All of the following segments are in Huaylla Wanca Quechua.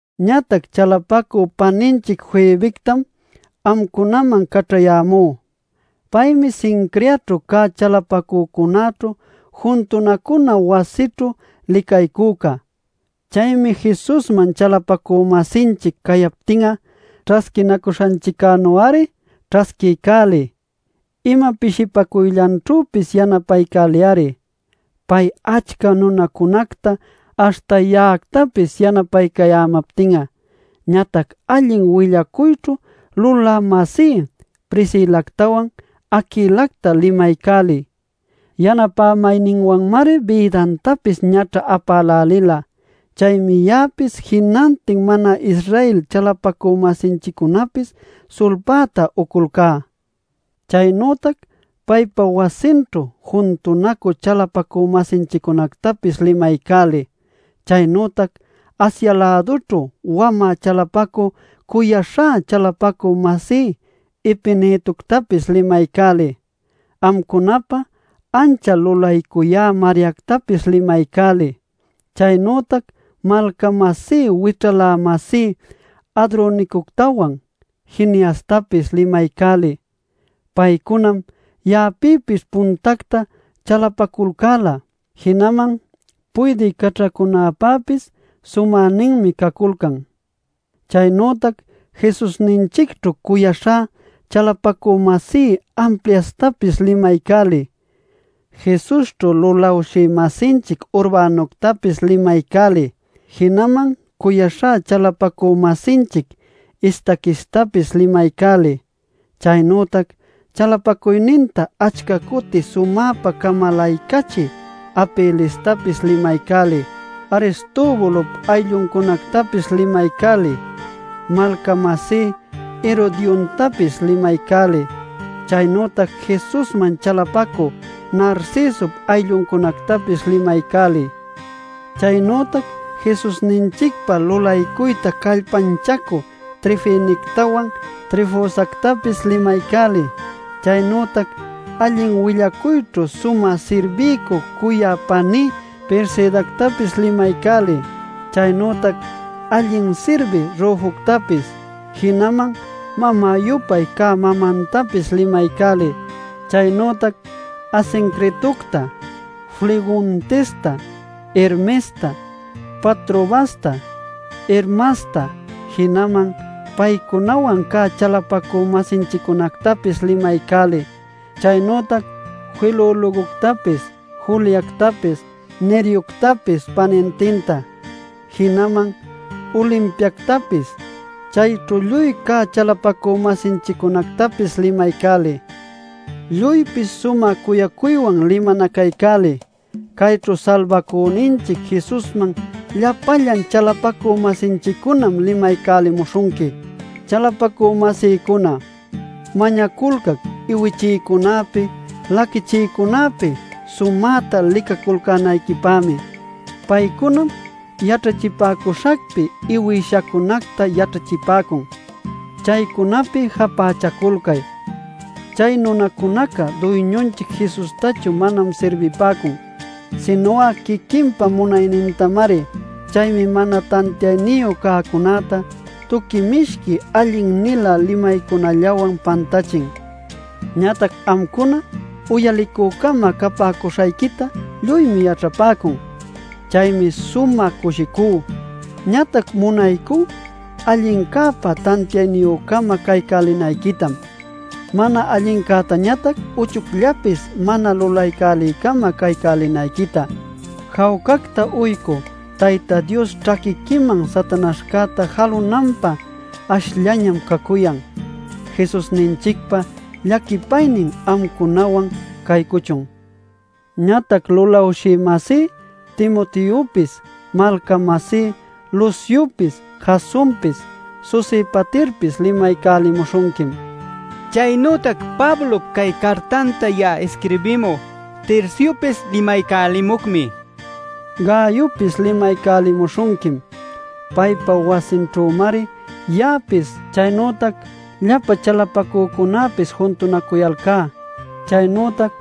Ñatac chalapacü paninchic Febectam amcunaman caćhayämú. Paymi Cencreaćhu cä chalapacücunäćhu juntunacuna wasićhu licaycüca. Chaymi Jesusman chalapacü-masinchic cayaptin'a ćhasquinacuśhanchiccänu-ari ćhasquiycäliy. Ima pishipacuyllanćhüpis yanapaycäliy-ari pay achca nunacunacta aśhta ya'actapis yanapaycayämaptin'a. Ñatac allin willacuyćhu lulä-masí Priscilactawan Aquilacta limaycäliy. Yanapämayninwanmari bïdantapis ñaćha apälälila. Chaymi ya'apis jinantin mana-Israel chalapacü-masinchiccunapis sulpäta uculcá. Chaynütac paypa wasinćhu juntunacü chalapacü-masinchiccunactapis limaycäliy. Chaynütac Asia-lädućhu wamä chalapacü cuyaśhá chalapacü-masí Epenetoctapis limaycäliy. Amcunapä ancha lulaycuyä Mariactapis limaycäliy. Chaynütac malca-masí wićhalä-masí Andronicoctawan Juniastapis limaycäliy. Paycunam ya'apïpis puntacta chalapaculcäla, jinaman puydï caćhacunäpäpis sumäninmi caculcan. Chaynütac Jesusninchicćhu cuyaśhá chalapacü-masí Ampliastapis limaycäliy. Jesusćhu lulawshï-masinchic Urbanuctapis limaycäliy. Jinaman cuyaśhá chalapacü-masinchic Estaquistapis limaycäliy. Chaynütac chalapacuyninta achca cuti sumäpa camalaycachï Apelestapis limaycäliy. Aristobulop aylluncunactapis limaycäliy. Malca-masí Herodiontapis limaycäliy. Chaynütac Jesusman chalapacü Narcisop aylluncunactapis limaycäliy. Chaynütac Jesusninchicpa lulaycuyta callpanchacü Trifenectawan Trifosactapis limaycäliy. Chaynütac allin willacuyćhu sumä sirbiycü cuyay paní Persidactapis limaycäliy. Chaynütac allin sirbï Rufoctapis, jinaman mamä-yupay cä mamantapis limaycäliy. Chaynütac Asincritocta, Flegontesta, Hermesta, Patrobasta, Hermasta, jinaman paycunawan cä chalapacü-masinchiccunactapis limaycäliy. Chaynütac Filologoctapis, Juliactapis, Nereoctapis panintinta, jinaman Olimpiactapis, chayćhu lluy cä chalapacü-masinchiccunactapis limaycäliy. Lluypis sumä cuyacuywan limanacaycäliy. Cayćhu Salbacüninchic Jesusman llapallan chalapacü-masinchiccunam limaycälimuśhunqui. Chalapacü-masïcuna, mañaculcac iwichïcunäpi, laquichïcunäpi, sumäta licaculcänayquipämi. Paycunam yaćhachipäcuśhacpi iwïshacunacta yaćhachipäcun. Chaycunapi japächaculcay. Chay nunacunaca Duyñunchic Jesustachu manam sirbipäcun, sinu'a quiquinpa munaynintamari. Chaymi mana tantiayniyu cäcunäta tuqui mishqui allin-nilä limaycunallawan pantächin. Ñatac amcuna uyalicü-cama capäcuśhayquitá lluymi yaćhapäcun. Chaymi sumä cushicú. Ñatac munaycú allincäpä tantiayniyü-cama caycälinayquitam; mana allincätañatac uchuyllapis mana lulaycälïcama caycälinayquita. Jawcacta uycü Tayta Dios ćhaquiquiman Satanaśhcäta jalünanpä ashllañam cacuyan. Jesusninchicpa llaquipaynin amcunawan caycuchun. Ñatac lulawshï-masí Timoteopis, malca-masí Luciopis, Jasonpis Sosipaterpis, limaycälimuśhunquim. Chaynütac Pablop cay cartanta ya'a isquirbimü Terciopis limaycälimucmi. Gayopis limaycälimuśhunquim. Paypa wasinćhümari ya'apis chaynütac llapa chalapacücunäpis juntunacuyalcá. Chaynütac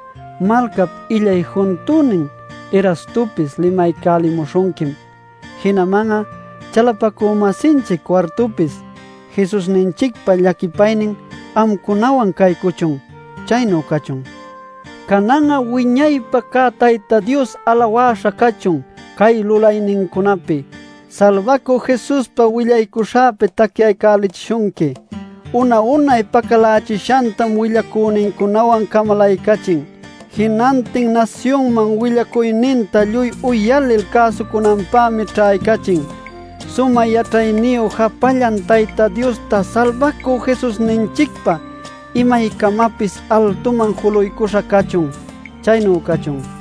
malcap illay juntünin Erastopis limaycälishunquim, jinaman'a chalapacü-masinchic Cuartupis. Jesusninchicpa llaquipaynin amcunawan caycuchun. Chaynu cachun. Canan'a wiñaypa cä Tayta Dios alawäśha cachun cay lulaynincunapi: Salbacü Jesuspi willacuśhäpa tacyacälichishunqui. Una-unay pacalächishantam willacünincunawan camalaycachin. Jinantin nasyunman willacuyninta lluy uyalil cäsucunanpämi ćhaycachin. Sumä yaćhayniyu japallan Tayta Diosta Salbacü Jesusninchicpa imaycamapis altuman juluycuśha cachun. Chaynu cachun.